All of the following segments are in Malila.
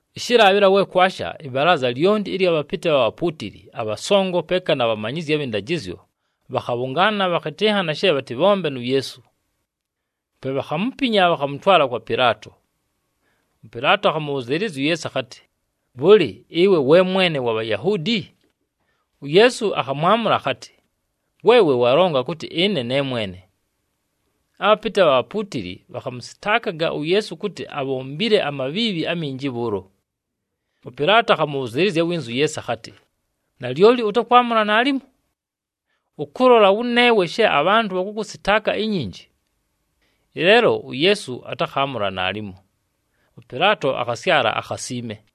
Ɨshɨlaabhɨla we kwasha, ɨbalaaza lyonti ɨlya bhapɨtɨ abha bhapuutili, abhasongo, peeka na bhamanyizyi abhɨ ndajɨzyo, bhakhabhʉngaana bhakhɨtɨnhana she bhatɨbhombe nu Yeesu. Pe bhakhamupinya, bhakhamʉtwala kwa Pɨlaato. ɄPɨlaato akhamʉbhʉzɨɨlɨzya uYeesu akhatɨ, “Bhʉlɨ, ɨwe we Mwene wa Bhayahuudi?” UYeesu akhamwamʉla akhatɨ, “Weewe walonga kʉtɨ ɨne ne mwene.” Abhapɨtɨ abha bhapuutili bhakhamʉsɨtaakaga uYeesu kʉtɨ abhombile amabhiibhi aminji bhʉʉlo. ɄPɨlaato akhamʉbhʉzɨɨlɨzya winza uYeesu akhatɨ, “Nalyoli ʉtakwamʉla naalimo? Ʉkʉlola wʉneewe she abhantʉ bhakʉkʉsɨtaaka inyinji.” Ɨleelo uYeesu atakhaamʉla naalimo. ɄPɨlaato akhasyala akhasiime!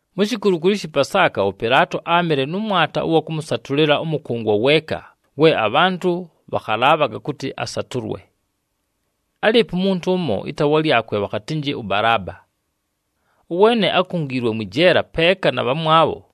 Mu shikulukulu ɨshɨ Pasaaka, ʉPɨlaato áamɨle nʉ mwata ʉwa kʉmʉsatʉlɨla ʉmʉkʉngwa weeka we abhantʉ bhakhalaabhaga kʉtɨ asatʉlwe. Álɨɨpo umuntu ʉmo ɨtaawa lyakwe bhakhatɨnjɨ ʉBalaaba. Ʉweene ákungiilwe mwɨ jeela peeka na bhamwabho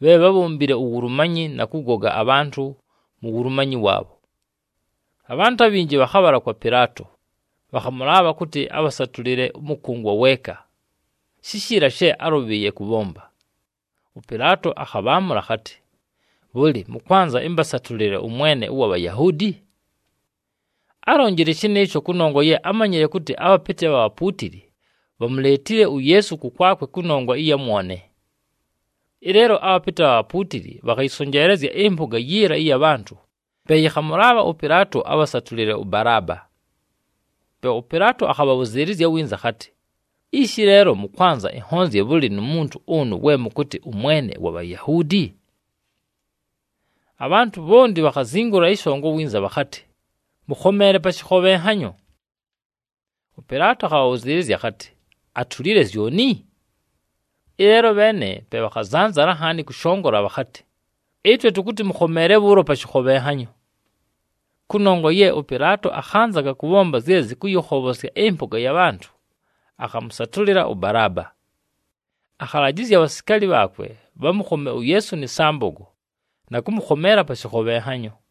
bhe bhábhombile uwulumanyi na kʉgoga abhantʉ mu wulumanyi waabho. Abhantʉ abhinji bhakhabhala kwa Pɨlaato, bhakhamʉlaabha kʉtɨ abhasatʉlɨle ʉmʉkʉngwa weeka, shishiila she álʉbhɨɨye kʉbhomba. ɄPɨlaato akhabhaamʉla akhatɨ, “Bhʉlɨ, mʉkwanza ɨmbasatʉlɨle ʉMwene ʉwa Bhayahuudi?” Álonjile shɨnɨɨsho kʉnongwa ye ámanyile kʉtɨ, abhapɨtɨ abha bhapuutili bhamuleetile uYeesu kʉkwakwe kʉnongwa ɨya mwone. Ɨleelo abhapɨtɨ abha bhapuutili bhakhayɨsonjeelezya ɨmpʉga yiila ɨya bhantʉ, pe yɨkhamʉlaabha ʉPɨlaato abhasatʉlɨle ʉBalaaba. Pe ʉPɨlaato akhabhabhʉzɨɨlɨzya winza akhatɨ, “Ishi leelo, mʉkwanza ɨnhonzye bhʉlɨ nu muntu ʉnʉ we mʉkʉtɨ ʉMwene wa Bhayahuudi?” Abhantʉ bhonti bhakhazingula ɨshongo winza bhakhatɨ, “Mʉkhomeele pa shɨkhobhenhanyo!” ɄPɨlaato akhabhabhʉzɨɨlɨzya akhatɨ, “Atulile zyoni?” Ɨleelo abheene pe bhakhazanzala nhaani kʉshongola bhakhatɨ, “Ɨtwe tʉkʉtɨ mʉkhomeele bhʉʉlo pa shɨkhobhenhanyo.” Kʉnongwa ye ʉPɨlaato akhanzaga kʉbhomba zye zɨkʉyɨkhobhosya ɨmpʉga ya bhantʉ, akhamʉsatʉlɨla ʉBalaaba. Akhalajɨzya abhasikaali bhaakwe bhamʉkhome uYeesu nɨ sambogo, na kʉmʉkhomeela pa shɨkhobhenhanyo.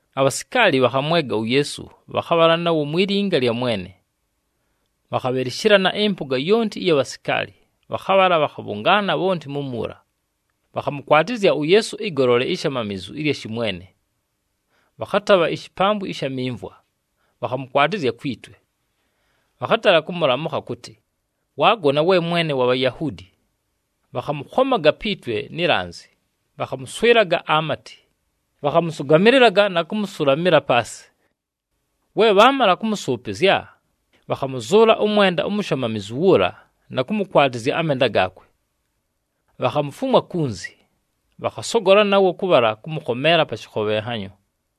Abhasikaali bhakhamwega uYeesu, bhakhabhala nawo mwi linga lya mwene. Bhakhabhɨlɨshɨlana ɨmpʉga yonti ɨya bhasikaali, bhakhabhala bhakhabhʉngaana bhonti mumuula. Bhakhamʉkwatɨzya uYeesu ɨgolole ishamamizu ɨlya shɨmwene. Bhakhatabha ishipambwi ɨsha mimvwa, bhakhamʉkwatɨzya kwi twe. Bhakhatala kʉmʉlamʉkha kʉtɨ, “Waagona, we Mwene wa Bhayahuudi!” Bhakhamʉkhomaga pi twe ni lanzi, bhakhamʉswɨlaga amatɨ, bhakhamʉsʉgamɨlɨlaga na kʉmʉsʉlamɨla paasɨ. We bhaamala kʉmʉsʉʉpɨzya, bhakhamʉzʉʉla ʉmwenda umushamamizu wuula na kʉmʉkwatɨzya amenda gaakwe. Bhakhamufumwa kunzi, bhakhasogola nawo kʉbhala kʉmʉkhomeela pa shɨkhobhenhanyo.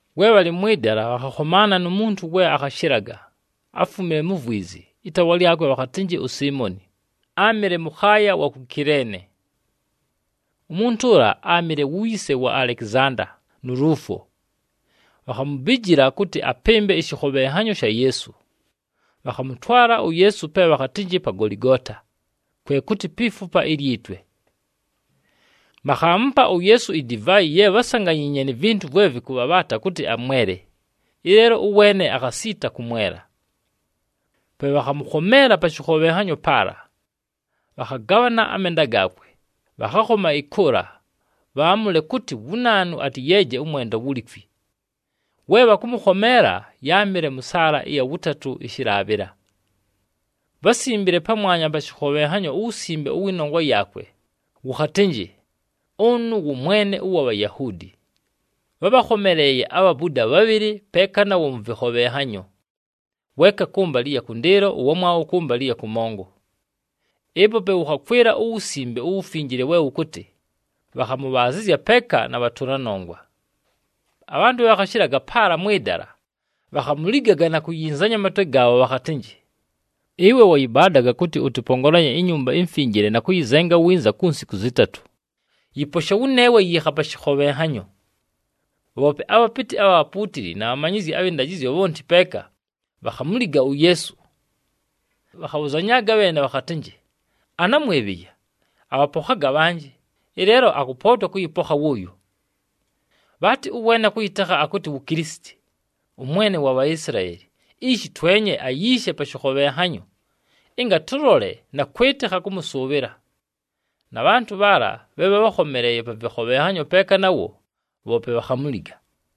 We bhalɨ mwɨ dala, bhakhakhomaana nu muntu we akhashɨlaga, áfumile mu vwizi. Ɨtaawa lyakwe bhakhatɨnjɨ uSiimoni, áamɨle mʉkhaaya wa ku Kileene. Umuntu ʉla áamɨle wu yise wa Alekizanda nu Luufo. Bhakhamubijila kʉtɨ apɨmbe ɨshɨkhobhenhanyo sha Yeesu. Bhakhamʉtwala uYeesu pe bhakhatɨnjɨ pa Goligoota, kwe kʉtɨ, “Pi Fupa ilyi Twe.” Bhakhaamupa uYeesu idivaayi ye bhásanganyiinye ni vintu vwe vɨkʉbhabhaata kʉtɨ amwele, ɨleelo ʉweene akhasiita kʉmwela. Pe bhakhamʉkhomeela pa shɨkhobhenhanyo paala, bhakhagabhana amenda gaakwe. Bhakhakhoma ɨkʉʉla bhaamʉle kʉtɨ wu naanu atɨyeeje ʉmwenda wulikwi. We bhakʉmʉkhomeela, yáamɨle mʉ saala ɨya wʉtatʉ, ɨshɨlaabhɨla. Bhásimbile pamwanya pa shɨkhobhenhanyo uwusimbe ʉwɨ nongwa yaakwe, wʉkhatɨnjɨ, “Ʉnʉ wʉ Mwene ʉwa Bhayahuudi.” Bhábhakhomeleeye abhabuda bhabhɨlɨ peeka nawo mʉ vɨkhobhenhanyo, weeka kʉmbalɨ ɨya kʉndɨɨlo, ʉwamwabho kʉmbalɨ ɨya kʉmongo. [ Ɨpo pe wʉkhakwɨla uWusimbe uWufinjile we wʉkʉtɨ, “Bhakhamʉbhaazɨzya peeka na bhatʉla nongwa.”] Abhantʉ bhe bhakhashɨlaga paala mwɨ dala, bhakhamuligaga na kuyinzanya amatwe gaabho bhakhatɨnjɨ, “Ɨwe wayɨbaadaga kʉtɨ ʉtɨpongolanye iNyumba iMfinjile na kʉyɨzenga winza ku nsiku zɨtatʉ. Yɨposhe wʉneewe, yiikha pa shɨkhobhenhanyo!” Bhoope abhapɨtɨ abha bhapuutili na bhamanyizyi abhɨ ndajɨzyo bhonti peeka, bhakhamuliga uYeesu. Bhakhabhʉzanyaaga bheene bhakhatɨnjɨ, “Ana mwebheya, abhapokhaga abhanjɨ, ɨleelo akʉpootwa kʉyɨpokha wʉʉyo! Bhaatɨ ʉweene akʉyɨtekha akʉtɨ wu Kilisiti, ʉMwene wa Bhaisilaeli. Ishi twenye ayiishe pa shɨkhobhenhanyo, ɨnga tʉlole na kwɨtɨkha kʉmʉsʉʉbhɨla.” Na bhantʉ bhaala bhe bhábhakhomeleeye pa vɨkhobhenhanyo peeka nawo, bhoope bhakhamuliga.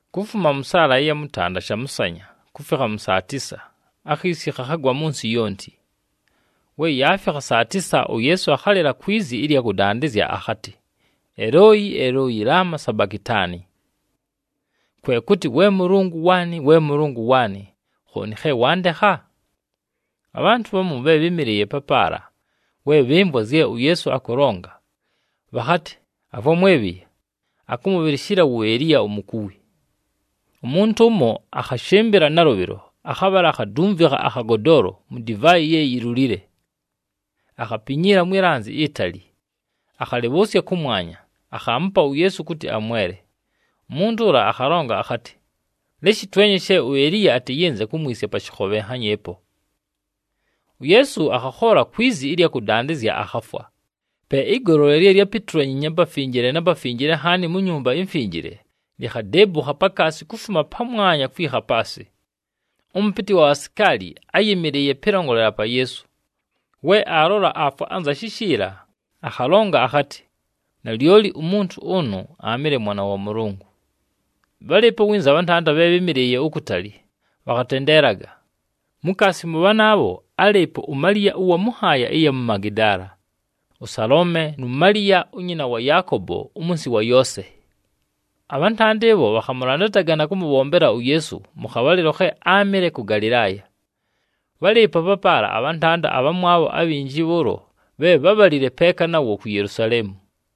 Kufuma mʉ saala ɨya mʉtanda shamʉsanya kufikha mʉ saa tisa, akhiisi khakhagwa mʉ nsɨ yonti. We yaafikha saa tisa, uYeesu akhalɨla kwi zi ɨlya kʉdandɨzya akhatɨ, “Elooyi! Elooyi! Lama sabakitaani?” Kwe kʉtɨ, “We Mʉlʉngʉ waanɨ! We Mʉlʉngʉ waanɨ! Khooni khe wandekha?” Abhantʉ bhamu bhe bhɨ́mɨlɨɨye papaala, we bhɨmvwa zye uYeesu akʉlonga, bhakhatɨ, “Avwa mwebheya! Akʉmʉbhɨlɨshɨla wu Eliya umukuwi.” Umuntu ʉmo akhashɨmbɨla nalʉbhɨlo akhabhala akhadumvikha akhagodoolo mu divaayi ye yilulile, akhapinyiila mwi lanzi itali, akhalɨbhʉʉsya kʉmwanya, akhaamupa uYeesu kʉtɨ amwele. Umuntu ʉla akhalonga akhatɨ, “Leshi twenye she uEliya atɨyɨnze kumwisya pa shɨkhobhenhanyo ɨpo!” UYeesu akhakhoola kwi zi ɨlya kʉdandɨzya, akhafwa. Pe ɨgolole lye lyápitulanyiinye aPafinjile na Pafinjile Nhaani mu Nyumba iMfinjile, likhadeebukha pakaasi kufuma pamwanya kwikha paasɨ. Ʉmʉpɨtɨ wa bhasikaali áyɨmɨlɨɨye pɨlongolela pa Yeesu. We aalola aafwa anza shishiila, akhalonga akhatɨ, “Nalyoli umuntu ʉnʉ aamɨle Mwana wa Mʉlʉngʉ!” Bhálɨɨpo winza abhantanda bhe bhɨ́mɨlɨɨye ukutali bhakhatendeelaga. Mukaasi mʉ bhanaabho, álɨɨpo uMaliya ʉwa mʉ nhaaya ɨya mu Magidaala, ʉSaloome, nu Maliya unyina wa Yaakobo umunsi wa Yoose. Abhantanda ɨbho bhakhamʉlandataga na kʉmʉbhombela uYeesu mʉ khabhalɨlo khe áamɨle kʉ Galɨlaaya. Bhálɨɨpo papaala na bhantanda abhamwabho abhinji bhʉʉlo bhe bhábhalile peeka nawo ku Yelusaleemu.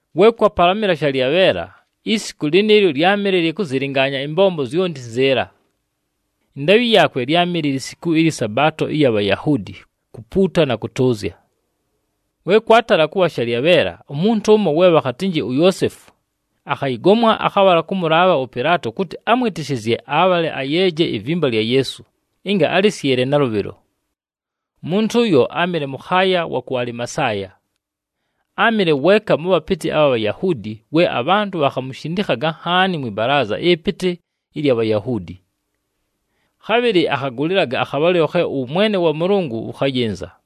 We kwapalamɨla shalyabheela, isiku lɨnɨɨlyo lyámɨle lya kʉzɨlɨngaanya ɨmbombo zyonti nzɨɨla. Ɨndaabhɨ yaakwe lyámɨle lisiku lyɨ Sabaato ɨya Bhayahuudi kupuuta na kʉtʉʉzya. We kwatala kʉbha shalyabheela, umuntu ʉmo we bhakhatɨnjɨ uYoosefu, akhayɨgomwa akhabhala kʉmʉlaabha ʉPɨlaato kʉtɨ amwɨtɨshɨzye abhale ayeeje ivimba lya Yeesu, ɨnga alɨsyɨle nalʉbhɨlo. Umuntu ʉyo áamɨle mʉkhaaya wa ku Alimasaaya. Áamɨle weeka mʉ bhapɨtɨ abha Bhayahuudi we abhantʉ bhakhamushindikhaga nhaani mwɨ balaaza ɨpɨtɨ ɨlya Bhayahuudi. Khabhɨlɨ akhagʉlɨlaga akhabhalɨlo khe ʉwʉmwene wa Mʉlʉngʉ wʉkhayɨnza.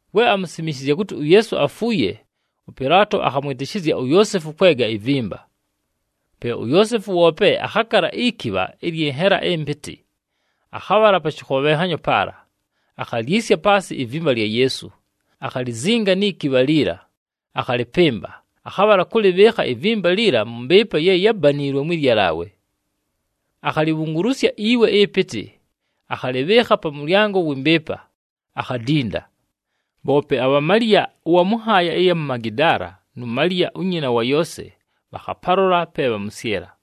We amusimishizya kʉtɨ uYeesu afuuye, ʉPɨlaato akhamwɨtɨshɨzya uYoosefu kwega ivimba. Pe uYoosefu woope akhakala ikibha ɨlyɨ nhela ɨmpɨtɨ. Akhabhala pa shɨkhobhenhanyo paala, akhalyisya paasɨ ivimba lya Yeesu, akhalizinga ni kibha liila. Akhalɨpɨmba, akhabhala kʉlɨbhɨɨkha ivimba liila mʉ mbɨɨpa ye yábaniilwe mwɨ lyalaawe. Akhalibhungulusya iwe ɨpɨtɨ, akhalɨbhɨɨkha pa mʉlyango wɨ mbɨɨpa, akhadinda. Bhoope abha Maliya ʉwa mʉ nhaaya ɨya mu Magidaala nu Maliya unyina wa Yoose, bhakhapalola pe bhamʉsyɨla.